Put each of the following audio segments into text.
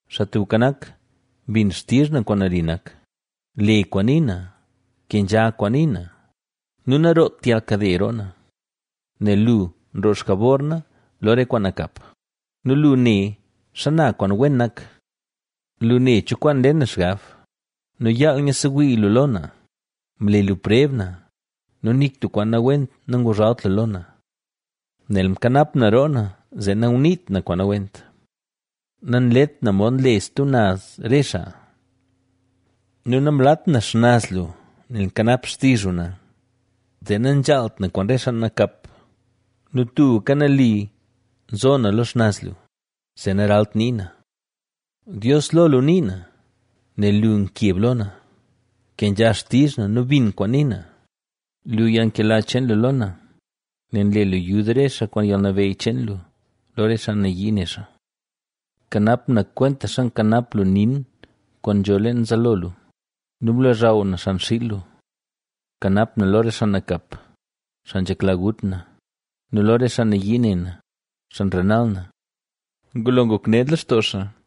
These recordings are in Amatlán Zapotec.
Xaa Tubka Nak, bin xtizh na kwaan nali nak; le kwaan nii na, kenzha kwaan nii na nu nanroot yalnkade roo na. Nel lu nroo xjabor na lo re kwaan nakap nu lu ne xana kwaan wen nak. Lu ne cho kwaan nle na xgab nu yaal nyiid sewii lu lo na; mle lu preb na nu nik tub kwaan nawent nanguzhalt lu lo na. Nel mkanap na roo na zee nanguniit na kwaan nawent, nanlet na mod nle stub naz re xaa. Nu namlat na xnaz lu nel nkanap xtizh lu na zee nazhaalt na kwaan re xaa nakap. Nu tubka nali zo na lo xnaz lu, zee naralt nii na. Dios, lo lu nii na, nel lu nkeb lo na, kenzha xtizh na nu bin kwaan nii na. Lu yalnkela cheen lu lo na, nel nle lu yud re xaa kwaan yalnabeyy cheen lu, lo re xaa nayii ne xaa. Kanap na kwentaxa nkanap lu nin kwaan nzho leen zaalo lu nu blozhaw na xan xiil lu. Kanap na lo re xaa nakap, xaa nzhekla gut na nu lo re xaa nayii ne na, xaa nrenal na. Ngulo ngok ned lextoo xaa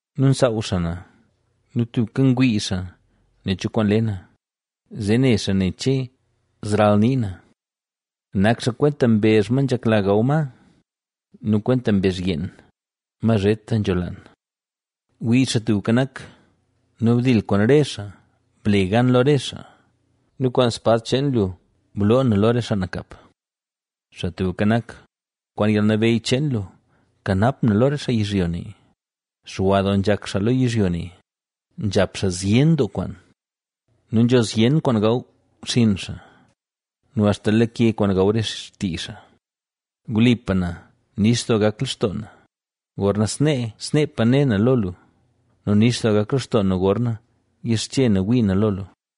nu nsaaw xaa na nu tubka ngwii xaa nen cho kwaan le na, zee ne xaa nen che zralnii na. Nak xaa kwenta mbezh ma nzhekla gaw ma nu kwenta mbezh yeen, ma zheta nzholaan. Wii, Xaa Tubka Nak, nu bdil kwaan re xaa ble gan lo re xaa nu kwaan spad cheen lu bloo na lo re xaa nakap. Xaa Tubka Nak, kwaan yalnabeyy cheen lu, kanap na lo re xaa yizhyo ne. Xwa doo nzhak xaa lo yizhyo ne, nzhap xaa zyen doo kwaan nu nzho zyen kwaan gaw xinn xaa nu axta lake kwaan gaw re xtii xaa. Wlipa na, nix doo gak lextoo na, gorna snee sneepa ne na lo lu nu nix doo gak lextoo na gorna yixche na wii na lo lu.